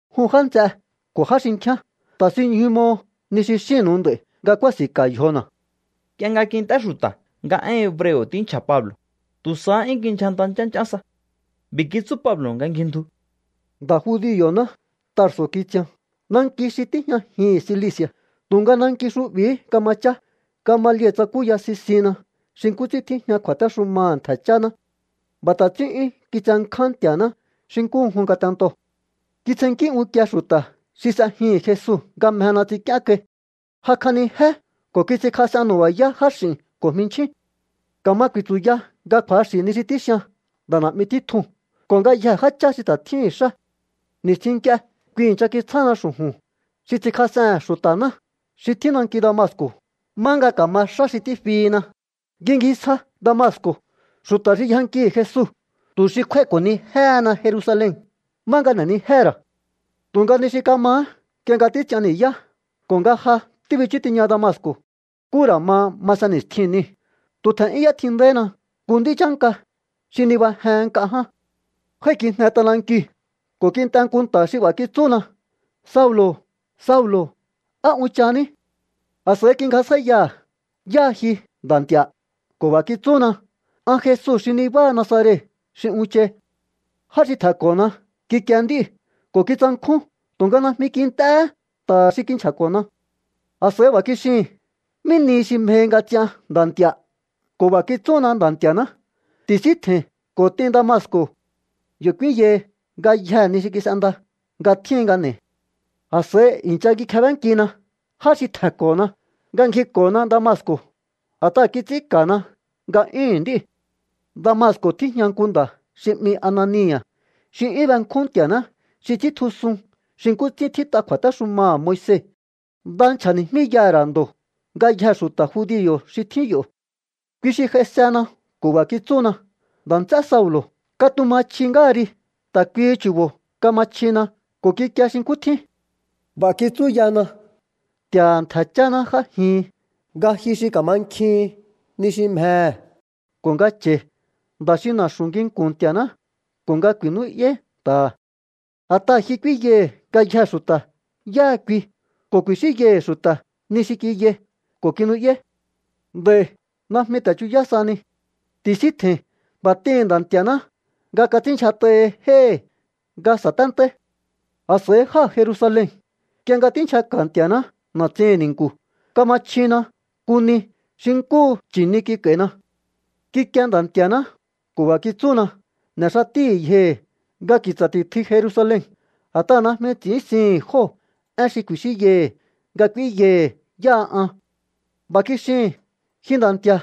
—Jun já nts'e ko̱ já xinkjíán, ta̱sinñju mo ni xi xínnu̱u nd'a̱i̱ nga kúási̱nka̱ yjona̱. Nk'ie nga kint'é xu̱ta̱ nga én hebreo̱ tínchja̱ Pablo̱, tu̱ sahá 'yún kindyjanta nch'ánch'án sa. B'i̱ kitsú Pablo̱ nga ngjindju: —Nda̱ judio̱ná. Tarso̱ kitsian, nanki xi tíjñajihi̱n Cilici̱a̱, tu̱nga nanki xu'bi̱hí kama chá. Gamaliel tsakúya sisinna xi nkú ts'ín tíjña kju̱a̱téxumaha̱ ntje̱ cháná. B'a̱ ta̱ ts'ín 'yún kitsenkján Nti̱a̱ná xi nkúhu jun ngatento. Kitsjennkí unkie xu̱ta̱ xi s'ejihi̱n Jesu nga mjena ts'ink'íén kai. Jakj'anijé ko̱ kits'inkjas'en nu̱ba̱yá jáx'i̱n ko̱ jminchjín. Ka̱ma ku̱i̱tsu̱ya nga kju̱axi̱ ni xi tíxian nda̱ na̱'mi títjuu̱n ko̱ ngayjee̱ jáchá xi ta̱ tjíhi̱n xá. Ni̱stjin nk'ie kui i̱ncha kitsjána xu̱ju̱n xi ts'inkjas'ehe̱n xu̱ta̱ná xi tjín nanki Damasco̱ má nga ka̱ma xá xi tífihina. Ngjingisja Damasco̱ xu̱ta̱ xi yjankihi̱ Jesu tu̱ xi kjúái̱ko̱nijéhena Jerusalen, má nga n'e̱nijéhe̱ ra̱. ’Tu̱nga ni xi kamahá, nk'ie nga títs'ian ni̱yá ko̱ nga ja tíbichú tiña Damasco̱, nkú ra̱ ma masen ni̱stjin niu̱, tu̱ tje̱n'yún y'étjindaihína nku nd'í chánka xi nibajehen nk'a ján. Jái̱kijne t'anankiu̱ ko̱ kint'e nku nta̱ xi b'a̱ kitsúna: “Saulo̱, Saulo̱, ¿á unchahaní?” A̱s'a̱i kingjasjáíyaha̱: “¿Yáha ji, Nda̱ Nti̱a̱?” Ko̱ b'a̱ kitsúna: “An Jesu xi nibáha Nazaret xi unchai.” Já xi tje̱nko̱na kikie nd'íu̱ ko̱ kitsankjún, tu̱nga najmi kint'éhé nta̱ha̱ xi kinchja̱ko̱na. ’A̱s'a̱i b'a̱ kixihin: “¿Mí nihi xi mjehi nga ts'ian, Nda̱ Nti̱a̱?” Ko̱ b'a̱ kitsúna Nda̱ Nti̱a̱ná: “Ti̱síntje̱i̱n ko̱ t'in Damasco̱. Yo̱ k'úínyahi ngayjee̱ ni xi kis'enda nga tjíhin nga n'e̱i̱.” A̱s'a̱i i̱ncha kikjebénkina já xi tje̱nko̱na nga ngjiko̱na Damasco̱, a̱t'aha̱ kits'ín ka̱na nga'yúhu̱n nd'íu̱. ’Damasco̱ tíjña nku nda̱ xi 'mi Anania̱ xi 'yún benkjún Nti̱a̱ná, xi ts'íntjusun xi nkú ts'ín tjít'a kju̱a̱téxumaha̱ Moise. Nda nchja̱ni̱jmíyaha̱ ra̱ ndo̱ ngayjee̱ xu̱ta̱ judio̱ xi tjín yo̱. Kui xi j'aisena ko̱ b'a̱ kitsúna: “Nda̱ nts'e Saulo̱, katuma chji ngáha ri.” Ta̱ kuihi chu̱bo̱ kama chjina ko̱ kikie xi nkú tjín. B'a̱ kitsúyana: “Nti̱a̱ha̱ ntje̱ cháná j'ájihin, nga ji xi ka̱mankjihin ni xi mjehe̱ ko̱ nga cha̱i̱ Nda̱ xi na̱xu̱ nginku̱n Nti̱a̱ná ko̱ nga ku̱i̱nú'yáí nta̱ha̱. A̱t'aha̱ ji k'úínyaihi̱ ngayjee̱ xu̱ta̱ yáha kui ko̱ ku̱i̱xínyaihi̱ xu̱ta̱ ni xi kiyai ko̱ kinu'yáí. Nd'a̱i̱ najmi ta̱ chuyá sahani. Ti̱síntje̱i̱n. B'a̱ t'ihi̱n Nda̱ Nti̱a̱ná nga kats'ínndyjat'ahi jéhi̱ nga sa̱téntáí.” ’A̱s'a̱i jáa̱ Jerusalen. Nk'ie nga tínchjaka̱ Nti̱a̱ná na̱tsihi̱n ni̱nku̱, kama chjina nku ni xi nkúhu nchi̱ni kik'a̱i̱na. Kikie Nda̱ Nti̱a̱ná ko̱ b'a̱ kitsúna: “N'e̱ xatíhi̱ yjohi̱ nga ki̱tsa̱ ti̱tjui Jerusalen. A̱t'aha̱ najmi ts'i̱ínsihi̱n jóo̱ én xi ku̱i̱xínyaihi̱ nga k'úínyaihi̱ yáha an.” B'a̱ kixihi̱n: “Ji Nda̱ Nti̱a̱,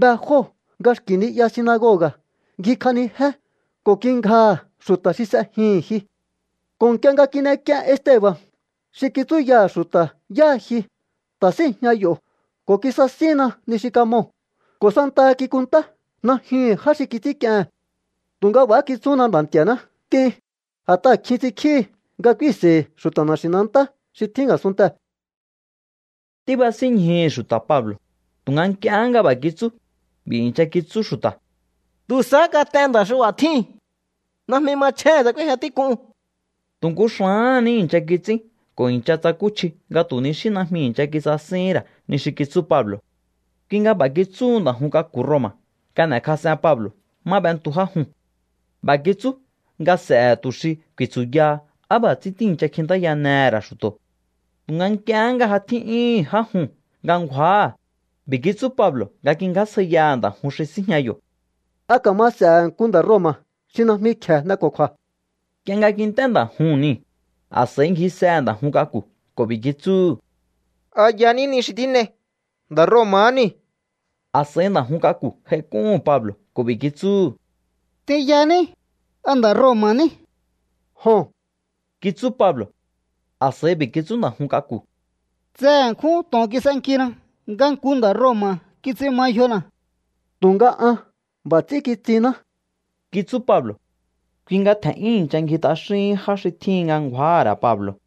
be jóo̱ nga xki̱ ni'ya sinagoga̱ ngjikj'anijé ko̱ kingjaha̱ xu̱ta̱ xi s'ejihi̱n ji. Ko̱ nk'ie nga tín'ek'ien Esteba̱n, xi kitsúyaha̱ xu̱ta̱ yáha ji, ta̱ síi̱jña yo̱ ko̱ kisasínna ni xi kamoo̱, ko̱ santaha kikunntá najyuhu̱n já xi kits'ínk'iehe̱n.” Tu̱nga b'a̱há kitsúna Nda̱ Nti̱a̱ná: “T'in. A̱t'aha̱ kjin ts'inkjíhi nga k'úínseihi̱ xu̱ta̱ na̱xi̱nantá xi tjín a̱sunntee̱.” Tíbasínñjuhu̱ xu̱ta̱ Pablo̱, tu̱nga nk'ie nga b'a̱ kitsú, b'i̱ i̱ncha kitsú xu̱ta̱: —¡Tu̱ sahá kat'en nda̱ xi b'a̱ tjíu̱n! ¡Najmi machjéhe̱n tsa k'úéjña tík'un! Tu̱ nku xa̱áha̱n ní i̱ncha kits'ín ko̱ i̱ncha tsakúchji nga tu̱ ni xí najmi i̱ncha kisasíhín ra̱ ni xi kitsú Pablo. Kui nga b'a̱ kitsúhu nda̱ jun k'aku̱ Roma̱ nga n'e̱kjas'en Pablo̱ má b'entu já juu̱n. B'a̱ kitsú nga s'e̱he̱ tu̱ xi ku̱i̱tsu̱yaha á b'a̱ ts'ín tíi̱ncha kjintáyanehe̱ ra̱ xu̱to̱. Tu̱nga nk'iehé nga ja tjín'yúhu̱n já juu̱n nga ngju̱áha̱, b'i̱ kitsú Pablo̱ nga kingjásjaiyaha̱ nda̱ jun xi síjña yo̱: —¿A ka̱ma s'ehe̱ nku nda̱ Roma̱ xi najmi kje̱e n'eko̱kju̱a̱? Nk'iehé nga kint'é nda̱ juu̱n niu̱, a̱s'a̱i ngjisehe̱ nda̱ jun k'aku̱ ko̱ b'i̱ kitsúhu̱: —¿Aha̱ yaní ni xi tín'ei? Nda̱ Roma̱há niu̱. A̱s'a̱i nda̱ jun k'aku̱ j'aik'úhu̱n Pablo̱ ko̱ b'i̱ kitsúhu̱: —T'inyaní, ¿a nda̱ Roma̱ ní? —Joho̱n —kitsú Pablo̱. A̱s'a̱i b'i̱ kitsú nda̱ jun k'aku̱: —Tse ṉkjún to̱on kis'enkina nga nku nda̱ Roma̱ kits'in ma yjona̱. —Tu̱nga an b'a̱ ts'ín kitsinná —kitsú Pablo̱. Kui nga tje̱n'yún i̱ncha ngji t'axíhín já xi tjíhin nga ngju̱áha̱ ra̱ Pablo̱,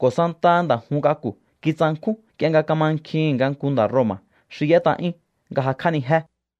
ko̱ santaha nda̱ jun k'aku̱ kitsankjún nk'ie nga kamankjihi̱n nga nku nda̱ Roma̱ xi y'ét'a'yún nga jakj'ánijé.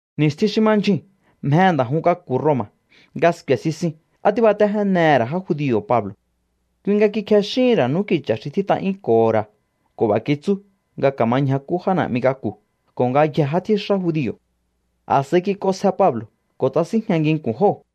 Ni̱stjin xi ma ndyjuu̱n mjehe̱ nda̱ jun k'aku̱ Roma̱ nga sku̱e̱ sisin á tíbatéjénehe̱ ra̱ já judio̱ Pablo̱. Kui nga kikjexíhi̱n ra̱ n'úki̱cha̱ xi tjít'a'yúnko̱ho̱ ra̱ ko̱ b'a̱ kitsú nga ka̱ma ñjakú já na̱'mi k'aku̱ ko̱ ngayjee̱ já tjíxá judio̱. A̱s'a̱i kik'onsje Pablo̱ ko̱ tsasínjña nginku̱n jóo̱.